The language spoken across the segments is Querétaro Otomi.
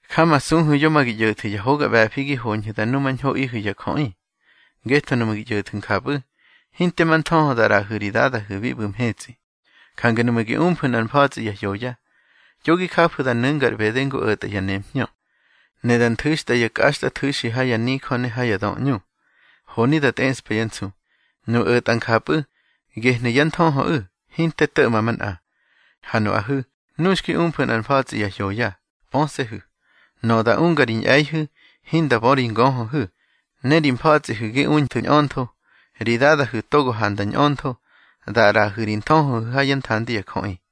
Jamasuhu̱ yo ma gi ꞌyo̱thu̱ ya hoga ꞌbe̱fi gi hoñhu̱ da numañhoꞌihu̱ ya jöꞌi. Ngetho nuꞌmu̱ gi ꞌyo̱thu̱ njapꞌu̱, hinte ma nthöhö da ꞌraꞌahu̱ ri Dadahu̱ bi ꞌbu̱ mhetsꞌi. Jange nuꞌmu̱ gi umfu̱ nꞌar mfa̱tsꞌi ya hyoya, yo gi jafu̱ da nu̱nga ar ꞌbede ngu o̱tꞌa ya nemhñö, ne da nthu̱xtꞌa ya kꞌaxtꞌathu̱xi ha ya nijö ne ha ya döꞌñu, honi da tꞌeꞌspa yá nsu. Nuꞌu̱ o̱tꞌa njapꞌu̱, gehnu̱ yá nthöhöꞌu̱, hinte to̱ꞌma manꞌa. Ha nuꞌahu̱, nu xki umfu̱ nꞌar mfa̱tsꞌi ya hyoya, pöse̱hu̱. Nöꞌö da unga ri ꞌñe̱ihu̱, hinda bö ri ngöhöhu̱. Ne ri mfa̱tsꞌihu̱ gi unthu̱ ñꞌöntho, ri Dadahu̱ togo handa ñꞌöntho, da ꞌraꞌahu̱ ri nthöhöhu̱ ha yá nthandi ya jöꞌi.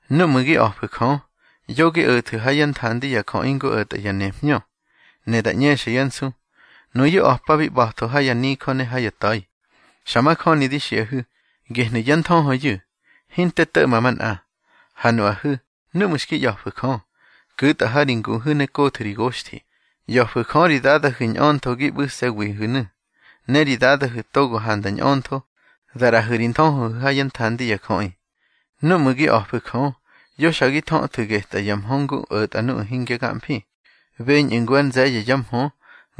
Núꞌmu̱ gi a̱fu̱ Jö, yo gi o̱thu̱ ha yá nthandi ya jöꞌi ngu o̱tꞌa ya nemhñö, ne da ꞌñexyá nsu. Nuyu̱ a̱pabi ꞌba̱tho ha ya nijö ne ha ya ta̱i. Xa majöni di xiꞌahu̱, gehnu̱ yá nthöhöyu̱, hinte to̱ꞌma manꞌa. Ha nuꞌahu̱, núꞌmu̱ xki ꞌya̱fu̱ Jö, ku̱tꞌa ha ri nguhu̱ ne kothu̱ ri goxthi. ꞌYa̱fu̱ Jö ri Dadahu̱ ñꞌöntho gi ꞌbu̱se̱wihu̱nu̱, ne ri Dadahu̱ togo handa ñꞌöntho, da ꞌraꞌahu̱ ri nthöhöhu̱ ha yá nthandi ya jöꞌi. Núꞌmu̱ gi a̱fu̱ Jö, yo xa gi thöthu̱ getꞌa ya mhö ngu o̱tꞌa nuꞌu̱ hingya gamfi, beñꞌu̱ ngu ár nze̱ye̱ ya mhö,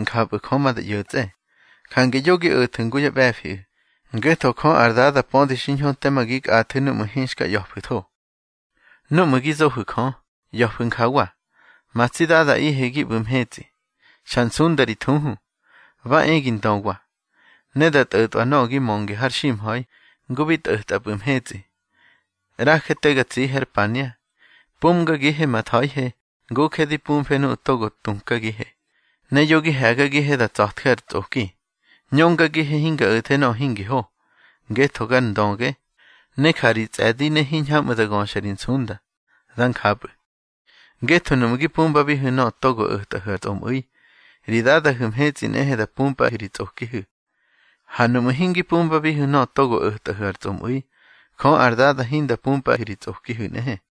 njapꞌu̱ Jö ma da ꞌyo̱tsꞌe. Jange yo gi o̱thu̱ ngu yá ꞌbe̱fiꞌu̱, ngetho Jö ar Dada pödi xiñho tema gi kꞌathu̱ núꞌmu̱ hinxka ꞌya̱fu̱tho. Núꞌmu̱ gi zohu̱ Jö, ꞌya̱fu̱ njawa: Ma tsi Dadaꞌihe gi ꞌbu̱ mhetsꞌi, xa nsunda ri thuhu. Ba e gi ndöwa, ne da tꞌo̱tꞌwa nöꞌö gi mönge har ximha̱i ngu bi tꞌo̱tꞌapꞌu̱ mhetsꞌi. ꞌRaje te ga tsihe ar pania. Pumgagihe ma tha̱ihe, nguje di pumfe nuꞌu̱ togo tukagihe. Ne yo gi he̱gagihe da tsa̱tje ar tsꞌoki, ñöngagihe hinga o̱the nöꞌö hingi ho. Ngetho gar ndöge, ne ja ri tsꞌe̱di ne hiñhamꞌu̱ da göxa ri nsunda. Dá njapꞌu̱. Ngetho nuꞌmu̱ gi pumbabihu̱ nöꞌö togo o̱tꞌahu̱ ar tsꞌomꞌu̱i, ri Dadahu̱ mhetsꞌi nꞌehe da pumpꞌahu̱ ri tsꞌokihu̱. Ha nuꞌmu̱ hingi pumbabihu̱ nöꞌö togo o̱tꞌahu̱ ar tsꞌomꞌu̱i, Jö ar Dada hinda pumpꞌahu̱ ri tsꞌokihu̱ nꞌehe.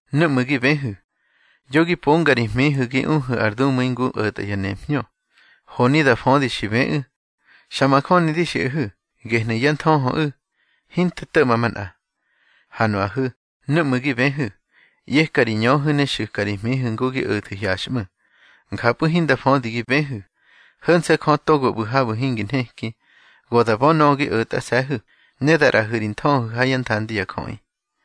Núꞌmu̱ gi bëhu̱, yo gi ponga ri hmihu̱ gi uhu̱ ar dumu̱i ngu o̱tꞌa ya nemhñö, honi da födi xi bëꞌu̱. Xa majöni di xiꞌahu̱, gehnu̱ yá nthöhöꞌu̱, hinte to̱ꞌma manꞌa. Ha nuꞌahu̱, núꞌmu̱ gi bëhu̱, ꞌyeka ri ñöhu̱ ne xu̱ka ri hmihu̱ ngu gi o̱thu̱ hyaxꞌmu̱. Njapꞌu̱ hinda födi gi bëhu̱. Ho̱nse̱ Jö togo ꞌbu̱ habu̱ hingi nheki, go da bö nöꞌö gi o̱tꞌase̱hu̱, ne da ꞌraꞌahu̱ ri nthöhöhu̱ ha yá nthandi ya jöꞌi.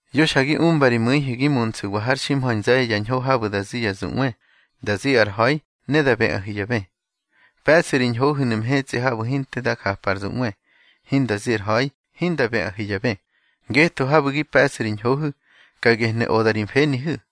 Yo xa gi umba ri mu̱ihu̱ gi munsu̱wa har ximha̱i nze̱ye̱ ya ñho habu̱ da zi ya zuꞌwe, da zi ar ha̱i ne da bëꞌahu̱ ya bë. Pe̱ꞌsu̱ ri ñhohu̱nu̱ mhetsꞌi habu̱ hinte da japa ar zuꞌwe, hinda zi ar ha̱i, hinda bëꞌahu̱ ya bë. Ngetho habu̱ gi pe̱ꞌsu̱ ri ñhohu̱, ka gehnu̱ oda ri mfenihu̱.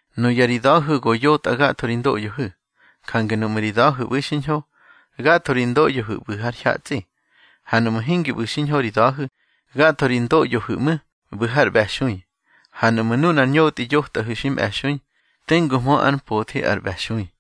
Nuya ri da̱hu̱ go yotꞌa gatho ri ndoꞌyohu̱, jange nuꞌmu̱ ri da̱hu̱ ꞌbu̱i xiñho, gatho ri ndoꞌyohu̱ ꞌbu̱ har hyatsꞌi. Ha nuꞌmu̱ hingi ꞌbu̱ xiñho ri da̱hu̱, gatho ri ndoꞌyohu̱ ꞌmu̱, ꞌbu̱ har ꞌbe̱xui. Ha nuꞌmu̱ nunar ñotꞌi yotꞌahu̱ xi mꞌe̱xui, tenguhmö ár mpothi ar ꞌbe̱xui.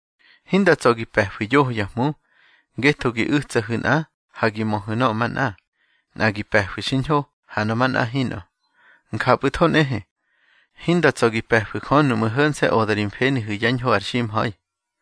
Hinda tsa̱ gi pe̱fu̱ yoho ya hmu, ngetho gi u̱tsahu̱ nꞌa, ha gi möhu̱ nöꞌö manꞌa. Nꞌa gi pe̱fu̱ xiñho, ha nöꞌö manꞌa hinꞌö. Njapꞌu̱tho nꞌehe, hinda tsa̱ gi pe̱fu̱ Jö nuꞌmu̱ ho̱nse̱ oda ri mfenihu̱ yá ñho ar ximha̱i.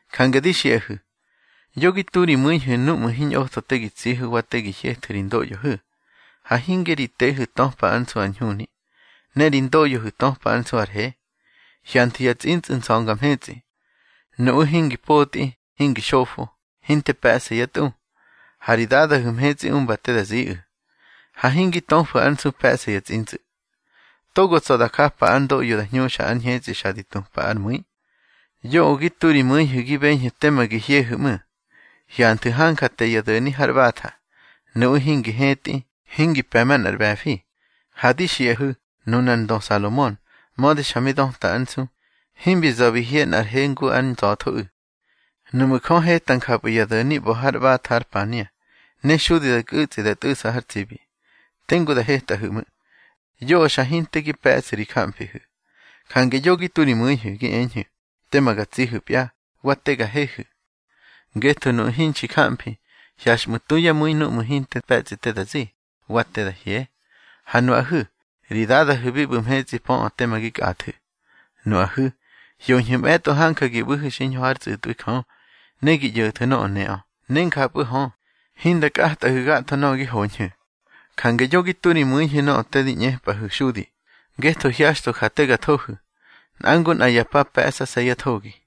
Jange di xiꞌahu̱, yo gi tu ri mu̱ihu̱ núꞌmu̱ hiñꞌotho te gi tsihu̱ wa te gi hyethu̱ ri ndoꞌyohu̱. Ha hinge ri tehu̱ töpa ár nsu ar ñhuni, ne ri ndoꞌyohu̱ töpa ár nsu ar he. Hyanthu̱ ya tsꞌintsꞌu̱ nza̱nga mhetsꞌi. Nuꞌu̱ hingi potꞌi, hingi xofo, hinte pe̱ꞌsa yá tꞌu, ha ri Dadahu̱ mhetsꞌi umba te da ziꞌu̱. Ha hingi töfu̱ ár nsu pe̱ꞌsa ya tsꞌintsꞌu̱. Togo tsa̱ da japa ár ndoꞌyo da hñuxa ár ñhetsꞌi xa di tupa ár mu̱i. Yoꞌö gi tu ri mu̱ihu̱ gi beñhu̱ tema gi hyehu̱ ꞌmu̱. Hyanthu̱ hanja te ya do̱ni har ꞌbatha. Nuꞌu̱ hingi hetꞌi, hingi pe̱ manꞌar ꞌbe̱fi. Ha di xiꞌahu̱, nunar ndö Salomon, mödi xa mi döta ár nsu, himbi za̱ bi hye nꞌar he ngu ár nza̱thoꞌu̱. Nuꞌmu̱ Jö heta njapꞌu̱ ya do̱ni ꞌba̱ har ꞌbatha ár pania, ne xudi da nkꞌu̱tsꞌi da tꞌu̱ꞌsa har tsibi, tengu da hetꞌahu̱ ꞌmu̱. Yoꞌö xa hinte gi pe̱ꞌsu̱ ri jamfihu̱. Jange yo gi tu ri mu̱ihu̱, gi eñhu̱: Tema ga tsihu̱pya, wa te ga hehu̱. Ngetho nuꞌu̱ hinxi jamfi, hyaxꞌmu̱ tu yá mu̱i núꞌmu̱ hinte pe̱tsꞌi te da zi, wa te da hye. Ha nuꞌahu̱, ri Dadahu̱ bi ꞌbu̱ mhetsꞌi pöꞌö teme gi kꞌathu̱. Nuꞌahu̱, hyoñhu̱ mꞌe̱tꞌo hanja gi ꞌbu̱hu̱ xiñho hár tsꞌu̱tꞌwi Jö, ne gi ꞌyo̱thu̱ nöꞌö neꞌö, ne njapꞌu̱ hö, hinda kꞌatꞌahu̱ gatho nöꞌö gi hoñhu̱. Jange yo gi tu ri mu̱ihu̱ nöꞌö te di ꞌñepꞌahu̱ xudi, ngetho hyaxtho ja te ga thohu̱. Nꞌa ngu nꞌa ya pa pe̱ꞌsase̱ yá thogi.